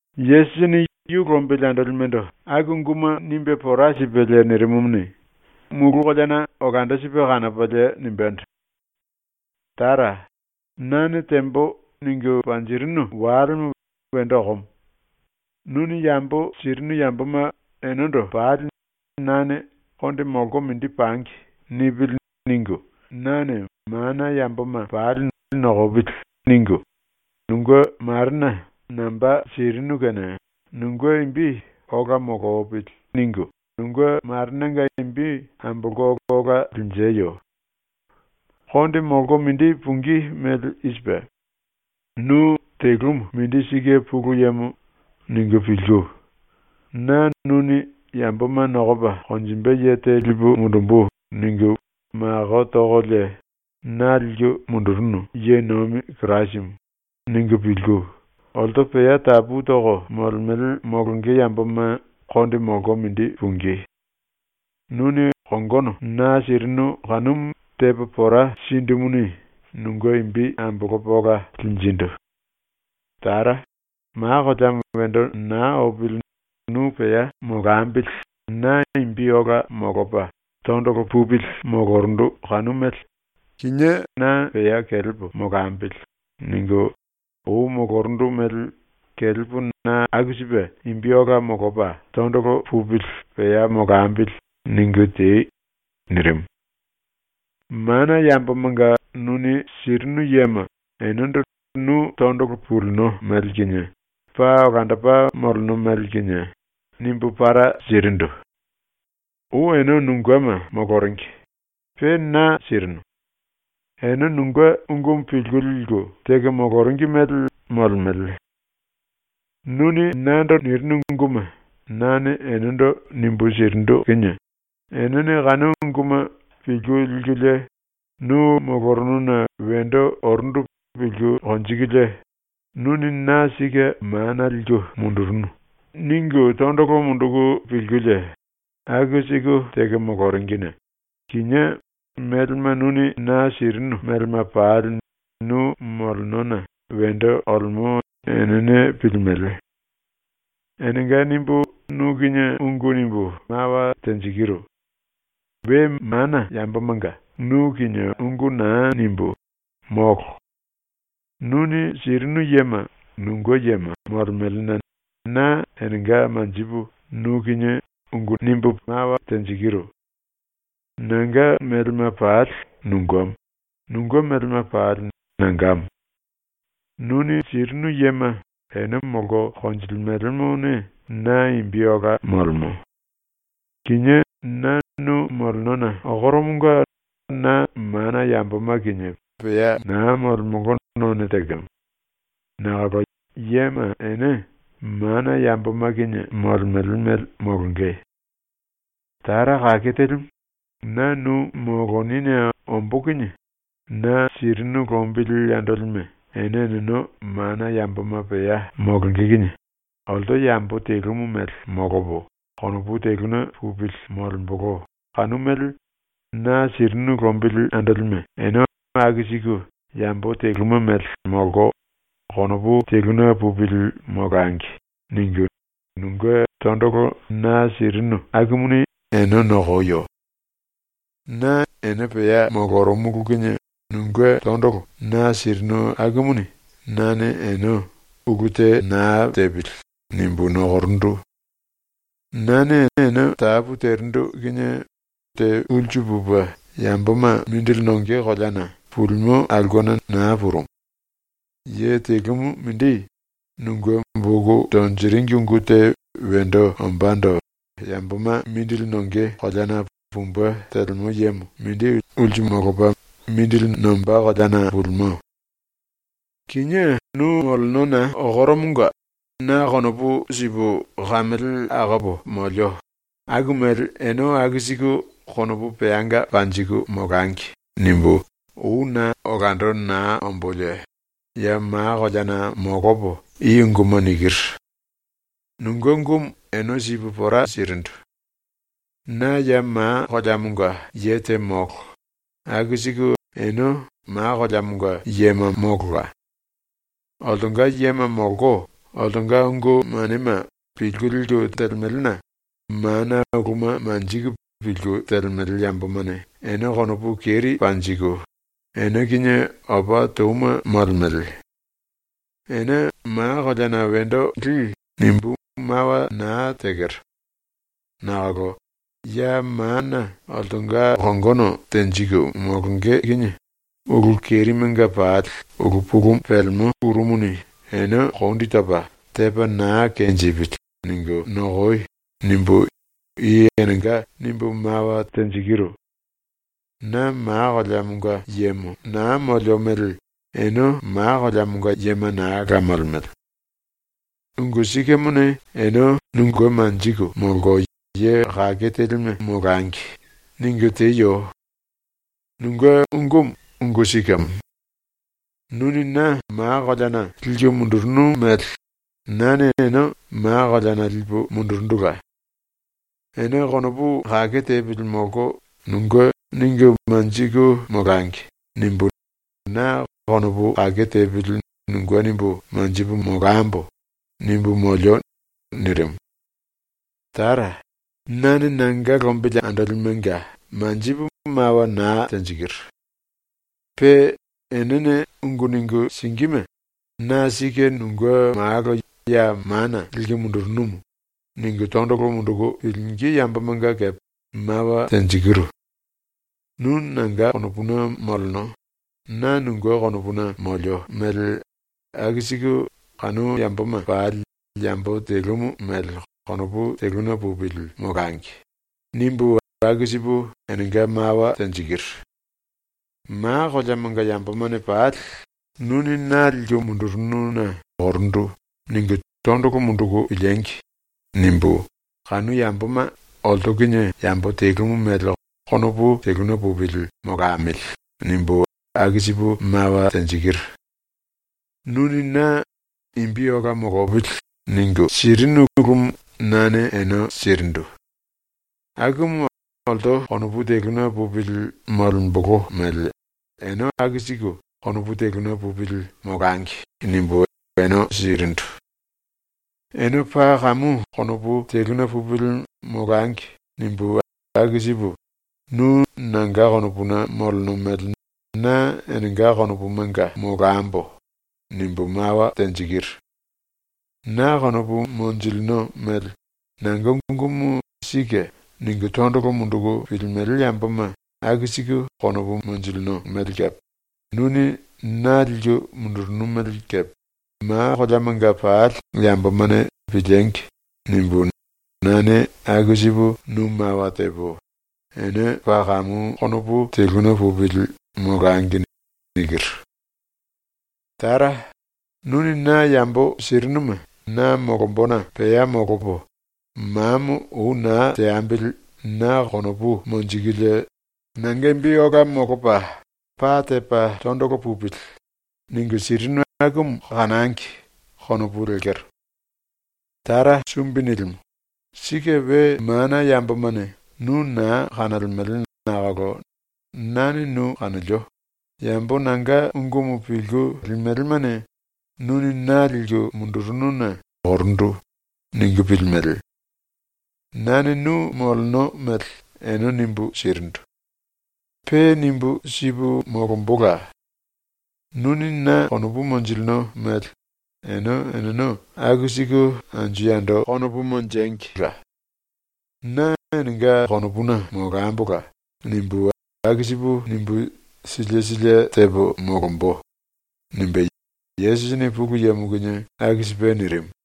Yesusini yu lombili andolimendo aku unguma nimbe pora sipelie nirimumuni, mulu koleana olando sipe kanopalie nimbendo: “Tara, nane tembo ningu panjirinu walemo wendo okomo. Nuni yambo sirinu yamboma enendo pali nane ‘ ‘Konde molko mindi pangi.’ nipili.’ ningu, nane mana yamboma pali ‘Nokopili.’ ningu, nunge Marena namba sirinu kene nunge imbi ‘Ola molopili.’ ningu nunge Marenanga imbi ambolko ola linjiyo. “Konde molko mindi pungí mele i sipe: ‘Nu telumu mindi sike Pulu Yemo.’ ningu pilku, ‘Na nuni ‘yamboma nokopa konjimbe ye te lipu mundumbu.’ ningu mako tokolie na liku mundurunu ye nomi Kirasimu.’ ningu pilku, olto pea tapu toko molemele molonge yamboma konde molko mindi pungí. Nuni kongono na sirinu kanumu tepo pora sindumuni nunge imbi ambolopo ola linjindu. Tara, ma koleamo wendo naa opili nu pea molambili na imbi ola molopa tondolo pupili molorundu kanu mele ‘Kinié na pea kelepo molambili.’ ningu ou molorundu mele ‘Kelepo na aku sipe imbi ola molopa tondolo pupili pea molambili.’ ningu tei.” ⸤nirimu.⸥ “Mana yambomanga nuni sirinu yema enendo nu tondolo pulino mele kinie, paa olandopa moleno mele kinie, nimbu para sirindu. Ou ene nungema moloringi, pe na sirinu. Ene nunge ungumu pilku liku teko moloringi mele molemele. Nuni nando nirinu unguma nane enendo nimbu sirindu kinie, enene kanu unguma pilku likulie nu molorununa wendo orundu pilku konjikulie ‘Nuni na sike mana liku mundurunu.’ ningu tondolo munduku pilkulie aku siku teko moloringine kinié melema nuni na sirinu melema pali nu molenona wendo olemo enene pilimele. “Enenga nimbu nu kinie ungu nimbu mawa tenjikiru. We mana yambomanga nu kinie ungu naa nimbú, molo. Nuni sirinu yema nunge yema molemelena na enenga manjipu nu kinie ungu nikiru. Nanga melema pali nungemo, nunge melema pali nangamo. Nuni sirinu yema ene molko konjilimelemone na imbi ola molemo. Kinié na nu molenona okoromonga na mana yamboma kinie pea naa molemolo none tekemo. Nakolo yema ene mana yamboma kinie molemele mele molonge. “Tara Kake Telimu, na nu molonine ombó kinie na sirinu lombili andolime ene eneno mana yamboma pea molonge kinie ‘Olto yambo telumu mele molopo konopu teluna pupili molembolo kanu mele na sirinu lombili andolime ene aku siku yambo telumu mele molko konopu teluna pupili molangi.’ ningu nunge tondolo na sirinu akumuni ene nokoyo. Na ene pea molorumulu kinie nunge tondolo na sirinu akumuni nane ene ‘ulu te naa tepili.’ nimbu nokorundu. Nane ene tapu terindu kinie ulsu pupe yamboma mindili nonge koleana pulimo aulkena naa purumu. Ye telumu mindi, nunge boku tonjiringi ungu te wendo ombándo yamboma mindili nonge koleana pumbe telemo yemo mindi ulsu molopa nombá koleana pulimo. “Kinié nu molenona okoromonga na konopu sipu kamele akopo molio ‘Aku mele ene aku siku konopu peanga panjiku molangi.’ nimbu ou na olando naa ombolie ya ma koleana molopo i unguma nikiru. Nunge ungumu ene sipu pora sirindu. Na ya ma koleamonga ye te molo, aku siku ene ma koleamonga yema molola. Oltonga yema molko oltonga ungu manema pilku liku telemelena mana uluma manjiku pilku telemele yambomane ene konopu keri panjiku ene kinie opa touma molemele. ‘Ene ma koleana wendo li.’ nimbu mawa naa tekero. Nakolo ‘ ‘⸤Ya mana oltonga kongono tenjiku molonge kinie⸥ ulu kerimenga pali ulu pulumu pelemo ⸤kuru⸥ muni ene kondi topa tepa naa kenjipili.’ ningu nokoi.’ nimbu i enenga nimbu mawa tekero. Na ma koleamonga yemo naa molio mele ene ma koleamonga yema naa la molemele. “‘Ungu sikemone ene nunge manjiku molko ye kake telime molangi.’ ningu teyo. Nunge ungumu ungu sikemo. Nuni na ma koleana liku mundurunu mele nane ene ma koleana lipu mundurundula. ‘Ene konopu kake tepili molko nunge ningu manjiku molangi.’ nimbu na ‘konopu kake tepili nunge nimbu manjipu molambo.’ nimbu molio.” ⸤nirimu.⸥ “Nane nanga lombili andolimenga manjipu mawa naa tenjikiru. Pe enene ungu ningu singíme ‘Na sike nunge malo ya mana liku mundurunu.’ ningu tondolo munduku pilingí yambomanga kepe mawa tenjikiru. ‘Tara, nu nanga konopuna moleno, na nunge konopuna molio mele aku siku kanu yamboma pali yambo telumu mele konopu teluna pupili molangi.’ nimbu aku sipu enenga mawa tenjikiru. ‘Ma koleamanga yambomane pali ‘Nuni na liku mundurununa orumu.’ ningu tondolo munduku piliengi!’ nimbu ‘kanu yamboma olto kinie yambo telumu mele konopu teluna pupili molamili.’ nimbu aku sipu mawa tenjikiru. Nuni na ‘Imbi ola molopili.’ ningu sirinu ulumu nane ene sirindu. Akumu ‘Olto konopu teluna pupili molembolo mele ene aku siku konopu teluna pupili molangi.’ nimbu ene sirindu. ‘Ene paa kamu konopu teluna pupili molangi.’ nimbu aku sipu “Nu nanga konopuna moleno mele na enenga konopumanga molambo.” nimbu mawa tenjikiru. Na konopu monjilino mele nanga ungumu ‘Sike.’ ningu tondolo munduku pilimele yamboma aku siku konopu monjilino mele kepe ‘nuni na liku mundurunu mele kepe, ma koleamanga pali yambomane piliengi!’ nimbu nane aku sipu nu mawa tepo ‘Ene paa kamu konopu teluna pupili molangi.’ nikiru. “Tara, ‘nuni na yambo sirinuma na molombona pea molopo, mamo ou naa teambili na konopu monjikulie ‘nanga imbi ola molopa pa tepa tondolo pupili.’ ningu sirinu akumu kanangi.’ konopu lekero. “Tara Sumbi Nilimu, sike we mana yambomane nu naa kanolemele nakolo nane nu kanolio, yambo nanga ungumu pilku limelemane ‘Nuni na liku mundurununa orumu.’ ningu pilimele. Nane nu moleno mele ene nimbu sirindu. Pe nimbu sipu molombola. ‘Nuni na konopu monjilino mele ene eneno aku siku anju yando konopu monjengila. Na enenga konopuna molambola.’ nimbu aku sipu nimbu sílie sílie tepo molombo.” nimbe Yesusini Pulu Yemo kinie aku sipe nirimu.